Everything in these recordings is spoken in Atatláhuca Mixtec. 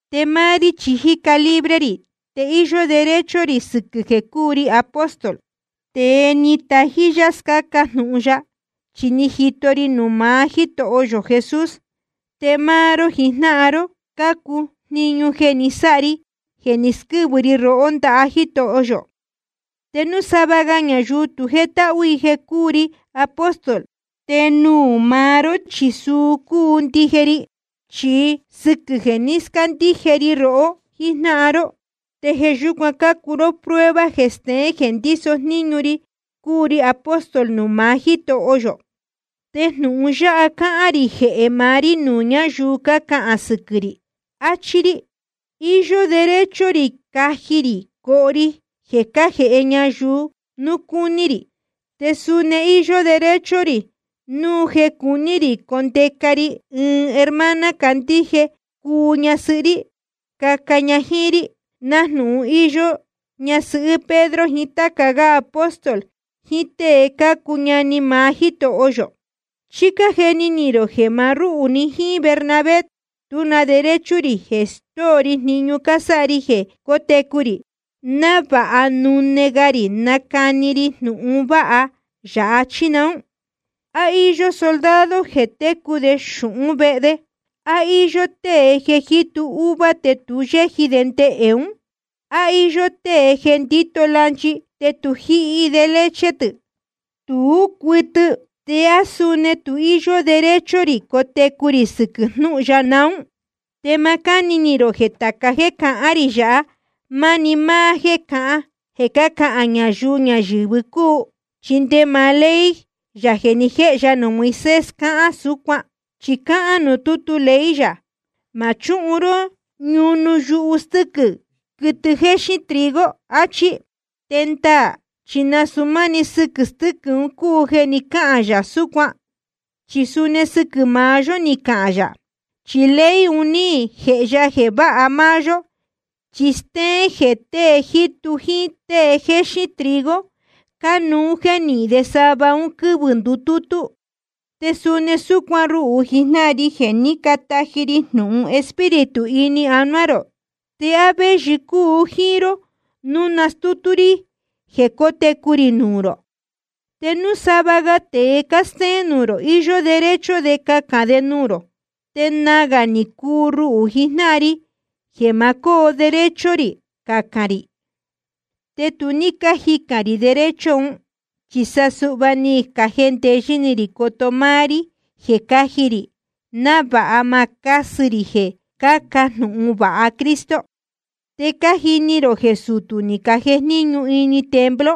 Te máá rí chi jíca libre rī, te íyó derecho rī sɨquɨ̄ jeē cúu ri apóstol, tēe ni tají yá scáca jnūhun ya. Chi ni jito ri nuū maá Jítoho yō Jesús, te máá ró jijnáhan ró cácuu jniñu jeē ni sáha ri jeē ni squɨ́vɨ ri rohó ndaha Jítoho yō. Te núu sava ga ñayuu tu jétáhú i jeē cúu ri apóstol, te nuū maá ró chi suu cúu ndije ri. Chi sɨquɨ̄ jeē ní scandíje ri rohó jíjnáhan ró, te jeē yúcuan cácuu ró prueba jeē steén jeē ndíso jníñu ri cúu ri apóstol nuū maá Jítoho yō. Te jnūhun yáha cáhán rī jehē maá rí nuū ñáyuu cácahān sɨquɨ̄ rī. Achí rí: Iyó derecho rī caji rī coho ri jeē cájēhe ñayuu núu cúní rī. Te suni íyó derecho rī núu jeē cuní rī condeca ri ɨɨn hermana candíje cuu ñasɨhɨ́ rí, caca ña jíín rí, nájnūhun íyó ñasɨhɨ́ Pedro jiín táca gá apóstol jiín tée cácuu ñani maá Jítoho yō. ¿Chí cájeni ni rō jeē maá rúhū‑ni jíín Bernabé tú na derecho rī jeē stóo ri jniñu cásáha ri jeē cótecu rī, návāha nune ga rī nacani ri jnūhun vāha ya, chí naún? ¿A íyó soldado jeē técu de xūhún vehe de? ¿A íyó tée jeē jítu uva te tu yéji de ndehē ún? ¿A íyó tée jeē ndíto lanchi te tu jíhi de leche tɨ̄? Tú cuɨtɨ. ¿Te á suni tu íyó derecho rī cotecu rī sɨquɨ̄ jnúhun ya naún? Te ma cáni ni rō jeē tāca jéē cahán rī yāhá, máni máá jéē cácahān ñayuu ñayɨ̄vɨ cúu. Chi nde maá ley yā jeē ni jéhe ya nuū Moisés, cáhán súcuan. Chi cáhán nuū tútu ley yā: Ma chúhun ró ñunu yuhu stɨ́quɨ̄, quɨtɨ jéxín trigo, achí. Te ndaā chi nasūu máni sɨquɨ̄ stɨ́quɨ̄ cúu jeē ni cáhān yā súcuan. Chi suni sɨquɨ̄ maá yó ní cahān yā. Chi ley un ní jēhe ya jeē váha máá yó, chi stéén jeē tēe jítu jíín tée jéxín trigo cánuú jeē nihín de sava un quɨ́vɨ̄ ndutútú. Te suni súcuan ruhū jijnáhan ri jeē ní cataji ri jnūhun Espíritu ini anuá rō, ¿te á véyɨ cúu jíín ró núu nastútú rí jeē cótecu rī nuū rō? Te núu sava ga tēe cástéén nuū rō, íyó derecho de cacān de nuū rō, te nagā ni cuu ruhū jijnáhan ri jeē ma cóo derecho rī cacān rī. Te tu ní cájicān rī derecho un, chi sa suhva ni jendeyɨ́ ni rī coto máá rí jeē cáji rī, návāha ma cásɨ rī jeē cáca jnūhun vāha Cristo. Te cájini rō jeē sutū ni cajejníñu ini templo,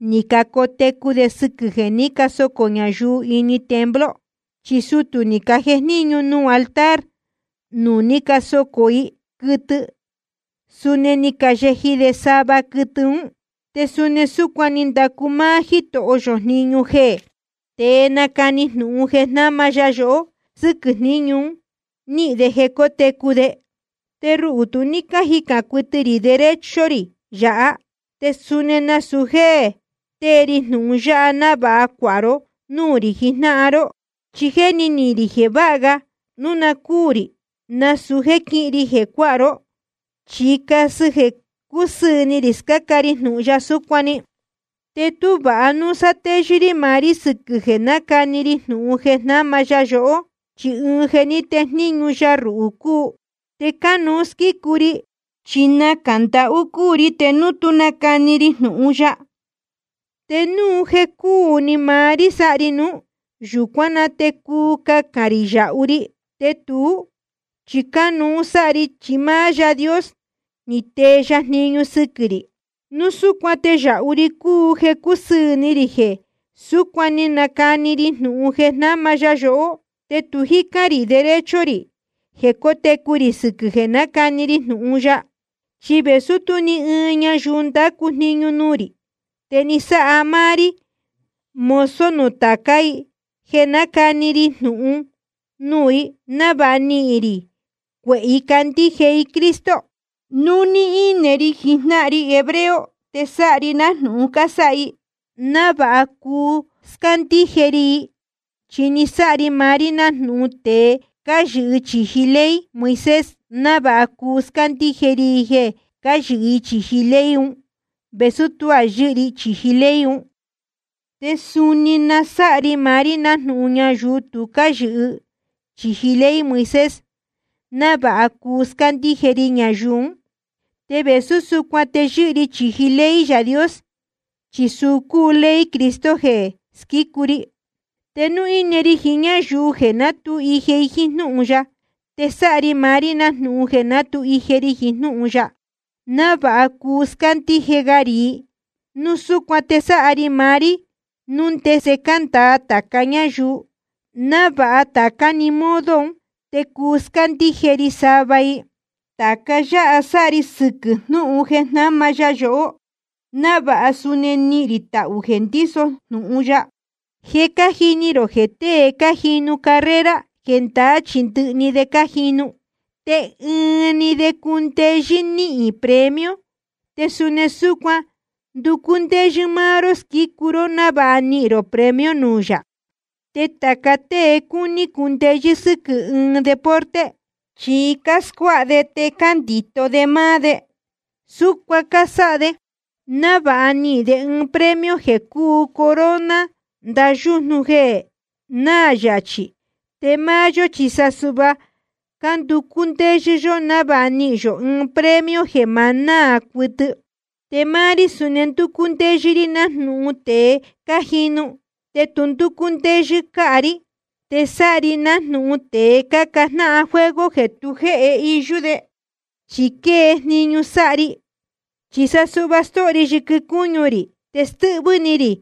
ni cacotecu de sɨquɨ̄ jeē ní casocō ñayuu ini templo. Chi sutū ni cajejníñu nuū altar nuū ní casocō i quɨtɨ, suni ni cayeji de sava quɨtɨ ún. Te suni súcuan ni ndacu máá Jítoho yō jniñu jeē tée cánacani jnūhun jeē jnáma ya yohó, sɨquɨ̄ jníñu un níhīn de jeē cótecu de. Te ruhū tu ní jícán cuɨtɨ rī derecho rī yāhá, te suni nasūu jéē tée ri jnūhun yáha návāha cuāha ró núū rī jijnáhan ró. Chi jéni ni rī jeē vāha ga núu na cúū rī nasūu jéē quíhin ri jeē cuáha ró, chi casɨ jeē cúsɨɨ̄ ni rī scáca ri jnūhun ya súcuan‑ni. Te tú vāha núu sátéyɨ́ rí maá rí sɨquɨ̄ jeē nácani ri jnūhun jeē jnáma ya yohó. Chi ɨɨn jeē ní tejníñu ya ruhū cúu, te cánuú squícu ri. Chi nacā ndahú cúu ri te núu tú nacani ri jnūhun ya. Te núu jeē cúu ni maá rí sáha ri nuú, yūcuán na te cuu cacān rī yāhu ri. Te tuú chi cánuú sáha ri, chi máá Yaā Dios ni tee ya jniñu sɨquɨ̄ rī. Núu súcuan te yāhu ri cúu jeē cúsɨɨ̄ ni rī jeē súcuan‑ni nácani ri jnūhun jeē jnáma ya yohó, te tu jícán rī derecho rī jeē cotecu rī sɨquɨ̄ jeē nácani ri jnūhun ya. Chi vēsú tú ni ɨɨn ñayuu ndácu jniñu nuū rī, te ni sáha ri maá rí mozo nuū tācá i jeē nácani ri jnūhun nuū i, návāha nihīn rī cuehē i candíje i Cristo. Núu íne ri jiín jnáhan ri hebreo te sáha ri nájnūhun cásáha i, návāha cuu scándíje ri i. Chi násáha ri maá rí nájnūhun tēe cáyɨhɨ chīji ley Moisés, návāha cuu scándíje ri i jeē cáyɨhɨ i chīji ley un, vēsú tuá yɨ́hɨ ri chīji ley un. Te suni násáha ri maá rí nájnūhun ñayuu tu cáyɨhɨ chīji ley Moisés, návāha cuu scándíje ri ñayuu ún. Te vēsú súcuan te yɨ́hɨ ri chīji ley Yaā Dios, chi suu cúu ley Cristo jeē squícu ri. Te núu íne ri jiín ñáyuu jeē ná tu ije jíín jnúhun ya, te sáha ri maá rí nájnūhun jeē ná tu ije ri jiín jnúhun ya, návāha cuu scándíje ga rī i. Núu súcuan te násáha ri maá rí núu ndese cándāa tāca ñáyuu, návāha tācá‑ni modo un te cuu scándíje ri sava i. Tāca yáha sáha ri jeē sɨquɨ́ jnúhun jeē jnáma ya yohó, návāha suni nihīn rī tahū jeē ndíso jnūhun ya. Je cájini rō jeē tée cájinu carrera, jendaá chi ndɨhɨ de cájinu, te ɨɨn‑ni de cúndeyɨ́ níhīn premio. Te suni súcuan nducú ndéyɨ́ máá ró squícu ró, návāha nihīn rō premio nuū yā. Te tāca tée cúní cundeyɨ́ sɨ́quɨ̄ ɨɨn deporte, chi cáscuáha de te cándito de máá de. Súcuan cásáha de návāha nihīn de ɨɨn premio jeē cúu corona ndaha yújnu jeē náā yachī. Te máá yó chi sa suhva cánducú ndéyɨ́ yó návāha nihīn yō ɨɨn premio jeē ma náā cuɨtɨ. Te máá rí suni ndúcú ndéyɨ́ rí nájnūhun tēe cájinu, te tu ndúcú ndéyɨ́ cāha rí. Te sáha ri nájnūhun tēe cácajnáhan juego jeē tu jéhe iyú de, chi quée jniñu sáha ri. Chi sa suhva stóho ri yɨquɨ cúñu rī, te stɨ́hvɨ́ ni rī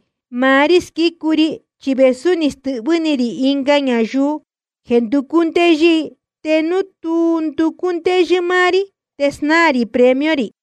maá rí squícu ri. Chi vēsú ni stɨ́hvɨ́ ni rī ɨnga ñayuu jeē nducú ndéyɨ́ i, te núu tu nducú ndéyɨ́ máá rí te snáā rī premio rī.